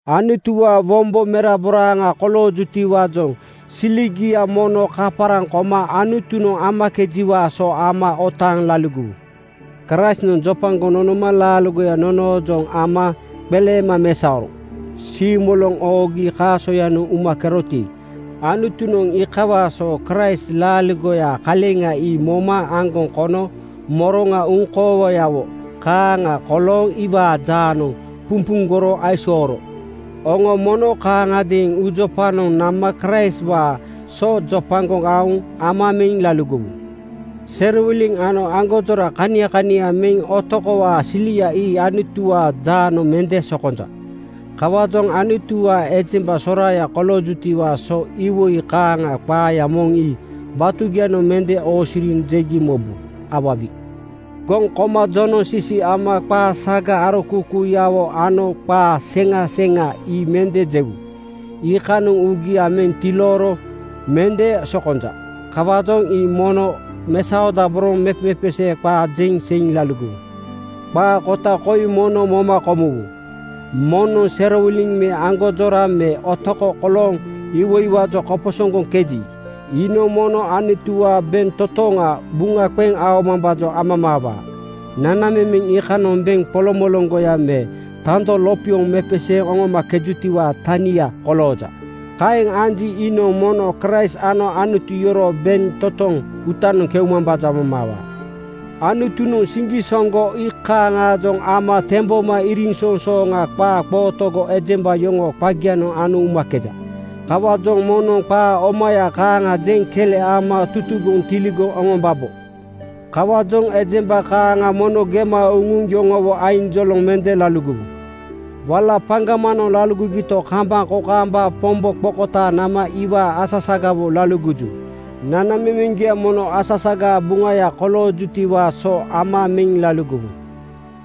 Anutuwaa wombo meraboraaŋa koloojutiwaajoŋ siligia mono kaparaŋ koma Anutunoŋ amakejiwaa so ama otaaŋ laligowu. Kraistnoŋ jopagoŋ nonoma laaligoya nonoojoŋ ama qeleema mesaoro. Siimoloŋ oogi kaasoyanoŋ umakeroti, Anutunoŋ iikawaa so Kraist laaligoyaa kaleŋa ii moma aŋgoŋ kono moroŋa uŋkoowayawo kaaŋa kolooŋ iwaa jaanoŋ pumpuŋgoro aisooro. Oŋo mono kaaŋagadeeŋ uujopanoŋ nama Kraistwaa so jopagoŋ aoŋ ama meŋ laligowu. Serowiliŋ ano aŋgonjora kania kania me otokowaa (greedy) silia ii Anutuwaa jaanoŋ mende sokonja. Kawaajoŋ Anutuwaa ejemba soraaya koloojutiwaa so iwoi kaaŋaa qaaya moŋ ii batugianoŋ mende oosiriŋ jegi mobu. Awawi! Goŋ koma jonoŋsisi ama qaa saga arokuukuuyawo ano qaa seŋa seŋa ii mende jewu. Iikanoŋ uugia meŋ tilooro mende sokonja. Kawaajoŋ ii mono mesaodaboroŋ mepemepesee qaa jeŋ seiŋ laligowu. Qaa kota koi mono moma komuwu: Moŋnoŋ serowiliŋ me aŋgonjora me otoko kolooŋ iwoiwaajoŋ koposoŋgoŋkeji, iinoŋ mono Anutuwaa bentotoŋa buŋa qeŋ aomambaajoŋ amamaawaa. Nanamemeŋ iikanoŋ beŋ qoloŋmoloŋgoya me tando lopioŋ mepeseeŋ oŋomakejutiwaa tania kolooja. Kaeŋ anji, iinoŋ mono Kraist ano Anutu yoroo bentotoŋ uutanoŋ keumambaajoŋ amamaawaa. Anutunoŋ siŋgisoŋgo iikaaŋaajoŋ ama temboma iriŋsoŋsooŋa qaa qootogo ejemba yoŋoo qagianoŋ ano umakeja. Kawaajoŋ moŋnoŋ qaa omaya kaaŋa jeŋ kele ama tutugoŋ tiligoŋ oŋombabo. Kawaajoŋ ejemba kaaŋa mono gema uŋuŋ yoŋowo ainjoloŋ mende laligowu. Wala paŋgamanoŋ laligogito, kambaŋ kokaamba Pombo qokotaaŋ nama iwaa asasagawo laligoju. Nanamemeŋgia mono asasagaa buŋaya koloojutiwaa so ama meŋ laligowu.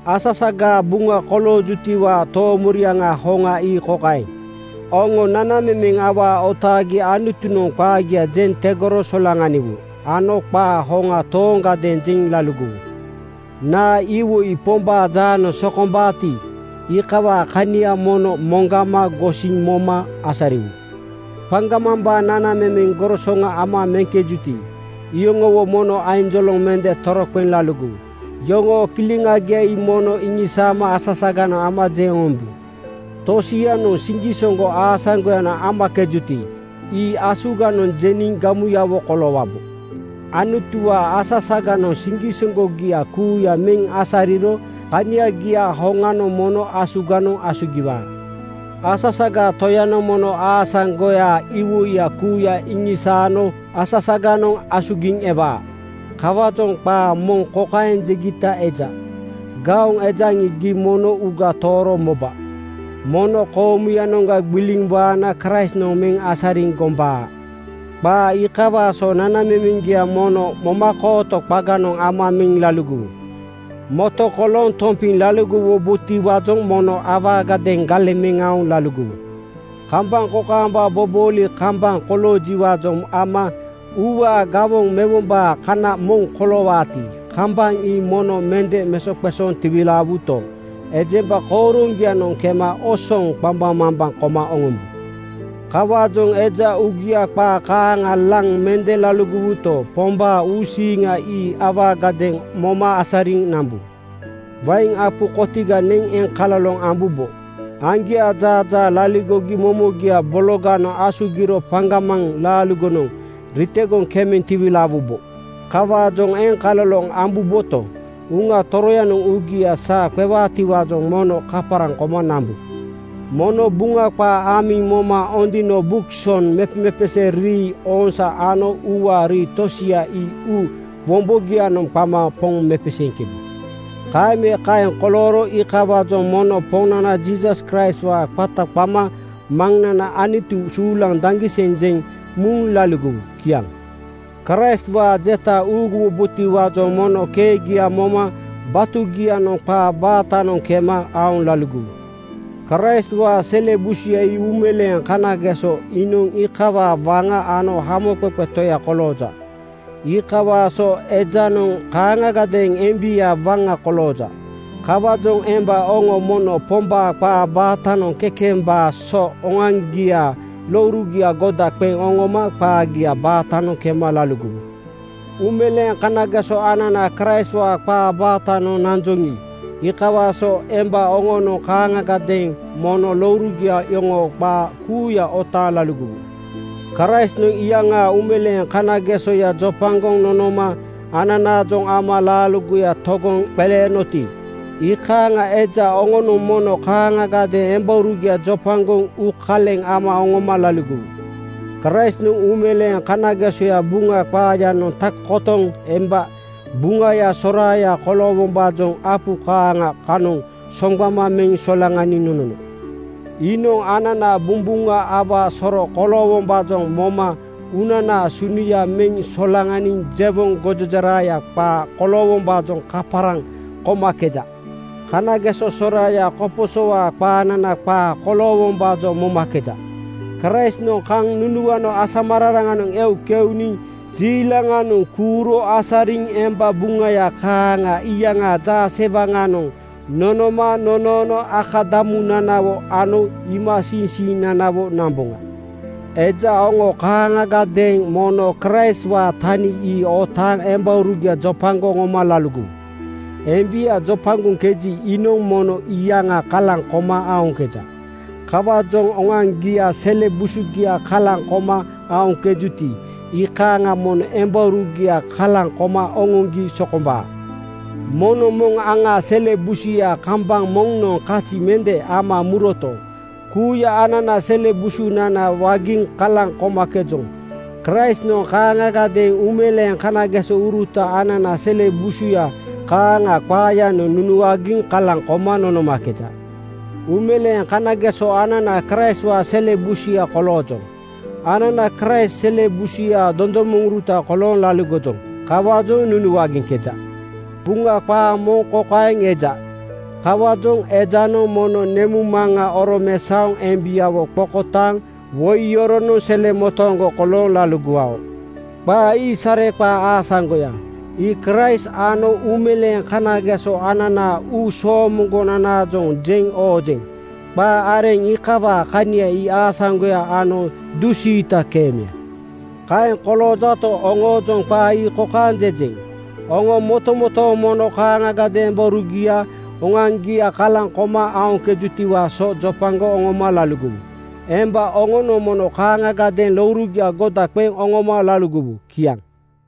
Asasagaa buŋa koloojutiwaa toomoriaŋa hoŋa ii kokaeŋ: Oŋo nanamemeŋ awaa otaagi Anutunoŋ qaagia jeŋ tegoro solaŋaniwu ano qaa hoŋa tooŋgadeeŋ jeŋ laligowu. Naa iwoi Pombaa jaanoŋ sokombaati, iikawaa kania mono moŋgama gosiŋ moma asariwu. Paŋgamambaa nanamemeŋ gorosoŋa ama meŋkejuti, iyoŋowo mono ainjoloŋ mende toroqeŋ laligowu. Yoŋoo kileŋagia ii mono iŋisaama asasaganoŋ ama jeŋ oŋombu. Tosianoŋ siŋgisoŋgo aasaŋgoyanoŋ amakejuti, ii asuganoŋ jeniŋ gamuyawo koloowabo. Anutuwaa asasaganoŋ siŋgisoŋgogia kuuya meŋ asariro kaniagia hoŋanoŋ mono asuganoŋ asugiwaa. Asasagaa Toyanoŋ mono aasaŋgoyaa iwoiya kuuya iŋisaano asasaganoŋ asugiŋ ewaa. Kawaajoŋ qaa moŋ kokaeŋ jegita eja, “Gaoŋ ejaŋi, gii mono uuga tooro moba. Mono koomuyanoŋga gbiliŋ waana Kraistnoŋ meŋ asariŋ gombaa.” Qaa iikawaa so nanamemeŋgia mono momakooto qaganoŋ ama meŋ laligowu. Moto kolooŋ tompiŋ laligowubotiwaajoŋ mono awaagadeeŋ galeŋ meŋ aoŋ laligowu. Kambaŋ kokaamba bobooli kambaŋ koloojiwaajoŋ ama uuwaa gawoŋ mewombaa kana moŋ koloowaati, kambaŋ ii mono mende mesoqesooŋ tiwilaawuto, ejemba kooroŋgianoŋ kema osoŋ qambaŋmambaŋ koma oŋombu. Kawaajoŋ eja uugia qaa kaaŋa laŋ mende laligowuto, Pombaa uusiiŋa ii awaagadeeŋ moma asariŋ nambu. Wain apu kotiga neŋ eŋkaloloŋ ambubo. Aŋgiaa jaajaa laligogi momogia bologanoŋ asugiro paŋgamaŋ laaligonoŋ ritegoŋ kemeŋ tiwilaawubo. Kawaajoŋ eŋkaloloŋ ambuboto, Uŋa Toroyanoŋ uugia saa qewaatiwaajoŋ mono kaparaŋ koma nambu. Mono Buŋa qaa amiŋ moma ondino (Buk soŋ), mepemepesee rii (ooŋsaa) ano uuwaa rii tosia ii uu wombogianoŋ qama Poŋ mepeseeŋkebu. Kaeŋ me kaeŋ kolooro iikawaajoŋ mono Poŋnana Jiisas Kraistwaa qata qama Maŋnana Anutu suulaŋ daŋgiseŋ jeŋ muŋ laligowu. Kiaŋ. Kraistwaa jeta uuguwubotiwaajoŋ mono keegia moma batugianoŋ qaa baatanoŋ kemeŋ aoŋ laligowu. Kraistwaa sele busuya ii uumeleeŋ kanageso. Iinoŋ iikawaa waŋa ano Hamoqeqe Toya kolooja. Iikawaa so ejanoŋ kaaŋagadeeŋ embiaa waŋa kolooja. Kawaajoŋ emba oŋo mono Pombaa qaa baatanoŋ kekembaa so oŋoaŋgiaa lourugia goda qeŋ oŋoma qaagia baatanoŋ kema laligowu. Uumeleeŋ kanageso anana Kraistwaa qaa baatanoŋ nanjoŋi, iikawaa so emba oŋonoŋ kaaŋagadeeŋ mono lourugia yoŋoo qaa kuuya otaaŋ laligowu. Kraistnoŋ iyaŋaa uumeleeŋ kanagesoya jopagoŋ nonoma ananaajoŋ ama laaligoya togoŋ qeleenoti, iikaaŋa eja oŋonoŋ mono kaaŋagadeeŋ embaurugia jopagoŋ uukaleŋ ama oŋoma laligowu. Kraistnoŋ uumeleeŋ kanagesoya Buŋa qaayanoŋ tak kotoŋ emba buŋaya soraaya koloowombaajoŋ apu kaaŋa kanoŋ soŋgbama meŋ solaŋaniŋ nonono. Iinoŋ anana bumbuŋa awaa soro koloowombaajoŋ moma uunanaa sunuya meŋ solaŋaniŋ jewoŋ gojejeraya qaa koloowombaajoŋ kaparaŋ komakeja. Kanageso soraaya koposowaa qaanana qaa koloowombaajoŋ momakeja. Kraistnoŋ kaŋ nunuano asamararaŋanoŋ eu keuniŋ jiilaŋanoŋ kuuro asariŋ emba buŋaya kaaŋa iyaŋaa jaasewaŋanoŋ nonoma nonoono akadamunanawo ano iimasiiŋsiinanawo namboŋa. Eja oŋo kaaŋagadeeŋ mono Kraistwaanoŋ tani ii otaaŋ embaurugia jopagoŋ oŋoma laligowu. Embia jopagoŋkeji, iinoŋ mono iyaŋa kalaŋ koma aoŋkeja. Kawaajoŋ oŋoaŋgiaa sele busugia kalaŋ koma aoŋkejuti, iikaaŋa mono embaurugia kalaŋ koma oŋoŋgi sokombaa. Moŋnoŋ moŋ aŋaa sele busuya kambaŋ moŋnoŋ kazi mende ama muroto, kuuya anana sele busunana wagiŋ kalaŋ komakejoŋ. Kraistnoŋ kaaŋagadeeŋ uumeleeŋ kanagesouruta anana sele busuya kaaŋa qaayanoŋ nunuagiŋ kalaŋ koma nonomakeja. Uumeleeŋ kanageso anana Kraistwaa sele busuya koloojoŋ. Anana Kraist sele busuyaa dondomoŋuruta kolooŋ laligojoŋ. Kawaajoŋ nunuagiŋkeja. Buŋa qaa moŋ kokaeŋ eja, “Kawaajoŋ ejanoŋ mono nemuŋmaŋa oromesaoŋ embiawo qokotaaŋ woi yoronoŋ selemotooŋgo kolooŋ laligowao.” Qaa ii sareqaa aasaŋgoya. Ii Kraist ano uumeleeŋ kanageso ananaa uu soomoŋgonanaajoŋ jeŋ oojeŋ. Qaa areŋ iikawaa kania ii aasaŋgoya ano dusiita keemeya. Kaeŋ koloojato, oŋoojoŋ qaa ii kokaeŋ jejeŋ: Oŋo motomotooŋ mono kaaŋagadeeŋ embaurugia oŋoaŋgia kalaŋ koma aoŋkejutiwaa so jopagoŋ oŋoma laligowu. Emba oŋonoŋ mono kaaŋagadeeŋ lourugia goda qeŋ oŋoma laligowu. Kiaŋ.